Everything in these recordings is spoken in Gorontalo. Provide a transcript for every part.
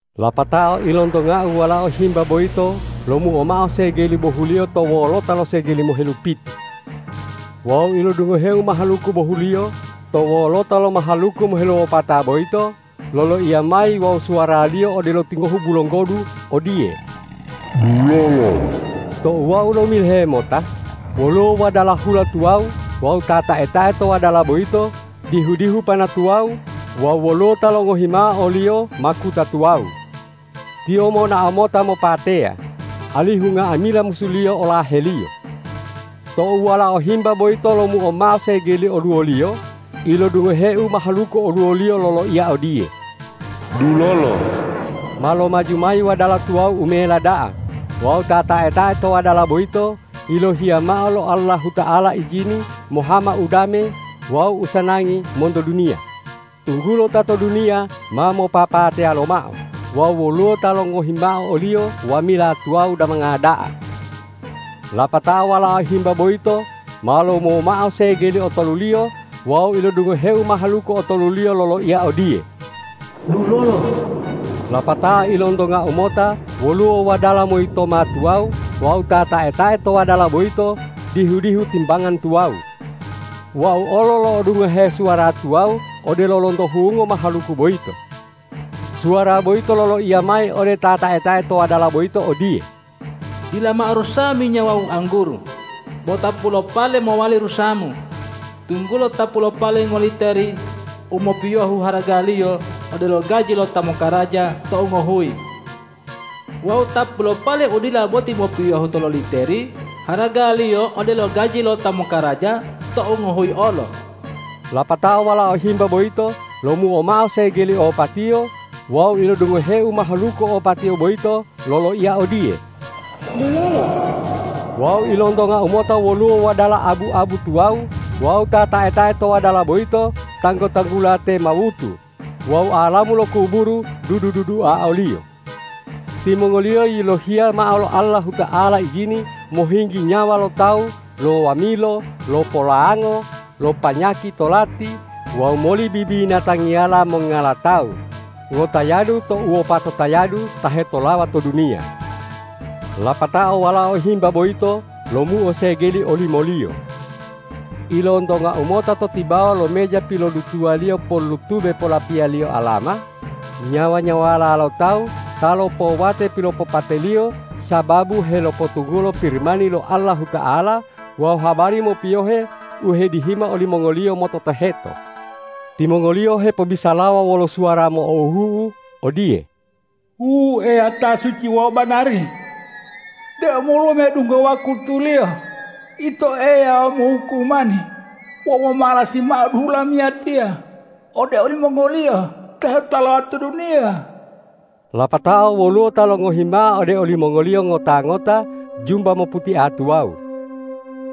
Lapatao ilontongau Walao Himba boyito lomuo mao segeli bohuliyo to wolota lo segeli mohelupitu. Wawu ilodungoheu mahaluku bohuliyo to wolota lo mahaluku moheluwopata boyito loloiya mayi wawu suwaraliyo odelo tingohu bulonggodu odiye,”Dulolo!” Tou wau lomilohe mota, woluwo wadala hula tuwawu wawu ta tae-tae to wadala boyito dihu-dihu pana tuwawu wawu woluwo ta longohi mao oliyo makuta tuwawu. Tiyo monao mota mopateya, alihu nga'amila musuliyo olaheliyo. Tou Walao Himba boyito lomuo mao segeli oluwoliyo, ilodungoheu mahaluku oluwoliyo loloiya odiye,”Dulolo!” Ma lomaju mayi wadala tuwawu u mela da'a wawu ta tae-tae to wadala boyito yilohiya mao lo Allahuta'ala ijini mohama udame wawu usanangi monto duniya, tunggulo ta to duniya ma mopapateya lomao wawu woluwo ta longohi mao oliyo wamila tuwawu damanga da'a. Lapatao Walao Himba boyito ma lomuo mao segeli otoluliyo wawu ilodungoheu mahaluku otoluliyo loloiya odiye,”Dulolo!” Lapatao ilontongau mota woluwo wadala moyitoma tuwawu wawu ta tae-tae to wadala boyito dihu-dihu timbangan tuwawu. Wau olo lo'odungohe suwara tuwawu odelo lonto hungo mahaluku boyito. Suwara boyito loloiya mayi ode ta tae-tae to wadala boyito odiye,”Dila mao rusawa minya wawu angguru, bo tapu lo pale mowali rusamu, tunggulo tapu lo pale ngoliteri u mopiyohu haragaliyo odelo gaji lo ta mokaraja tou ngohuyi. Wawu tapu lo pale u dila boti mopiyohu tololiteri haragaliyo odelo gaji lo ta mokaraja tou ngohuyi olo.” Lapatao Walao Himba boyito lomuo mao segeli opatiyo wawu ilodungoheu mahaluku opatiyo boyito loloiya odiye,”Dulolo!” Wawu ilontongau mota woluwo wadala abu-abu tuwawu wawu ta tae-tae to wadala boyito tanggu-tanggula te Mawutu wawu alamu lo kuburu dudu-dudua oliyo. Timongoliyo yilohiya mao lo Allahuta'ala ijini mohinggi nyawa lo tawu lo wamilo, lo polango, lo panyaki tolati wawu moli bibinatangiyala mongngala tawu ngotayadu to uwopato tayadu ta hetolawa to duniya. Lapatao Walao Himba boyito lomuo segeli olimoliyo. Ilontongau mota to tibawa lo meja pilodutuwaliyo pollutube polapilaliyo alama nyawa-nyawala lo tawu ta lopowate pilopateyaliyo sababu helopotunggulo Pirimani lo Allahuta'ala wawu habari mopiyohe u hedihima olimongoliyo mototoheto. Timongoliyo hepobisalawa wolo suwara mo'ohu'u odiye,”Wu Eya ta suci wawu banari! De omoluwa medungga wakutuliyo Ito Eya mohukumani wawu momalasi mao duhu lamiyatiya ode olimongoliyo ta hetolawa to duniya?” Lapatao woluwo ta longohi mao ode olimongoliyo ngota-ngota jumba moputia tuwawu.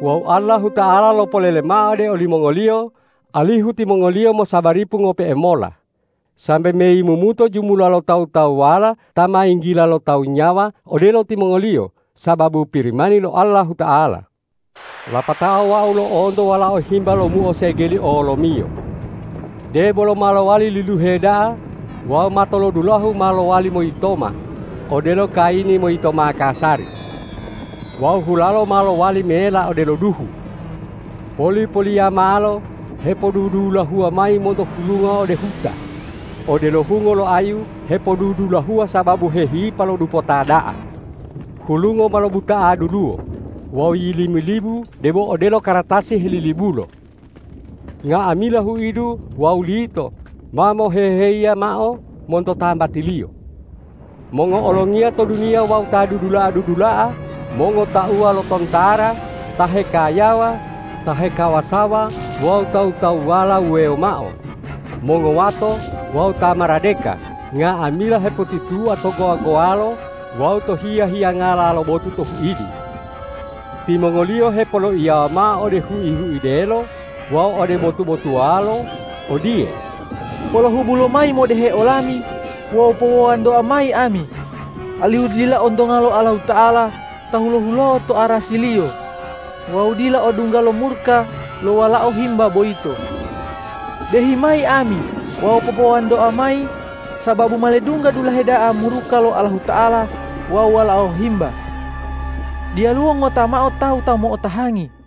Wawu Allahuta'ala lopolele mao ode olimongoliyo, alihu timongoliyo mosabaripo ngope'e mola, sambe meyimumuto jumula lo tawu-tawuwala ta ma yinggila lo tawu nyawa odelo timongoliyo sababu Pirimani lo Allahuta'ala. Lapatao wau lo'onto Walao Himba lomuo segeli olomiyo. Debolo ma lowali liluhe da'a wawu matolodulahu ma lowali moyitoma odelo kayini moyitoma kasari. Wawu hulalo ma lowali mela odelo duhu. Poli-poliyamalo hepodudulahuwa mayi monto hulungo ode huta, odelo hungo lo ayu hepodudulahuwa sababu hehipa lo dupota da'a. Hulungo ma lobuta'a duluwo wawu yilimilibu debo odelo kartasi helilibulo. Nga'amila huidu wawu lito ma moheheyi mao monto tambatiliyo. Mongo'olongiya to duniya wawu ta dudula'a-dudula'a, mongotauwa lo tontara, ta hekayawa, ta hekawasawa wawu tawu-tawuwala wuwewo mao, mongowato wawu ta maradeka, nga'amila hepotitua to gowa-gowalo wawu to hiya-hiyangala lo botu to huidu. Timongoliyo hepoloiyawa mao ode hui-huidelo wawu ode botu-botuwalo odiye,”Polohubu lomayi modehe olami wawu popowantoa mayi ami, alihu dila ontonga lo Allahuta'ala ta hulo-huloa to arasi-Liyo wawu dila odungga lo muruka lo Walao Himba boyito. Dehi mayi ami wawu popowantoa mayi sababu ma ledungga dulahe da'a muruka lo Allahuta'ala wawu Walao Himba. Diyaluwo ngota mao tawu ta mo'otahangi.”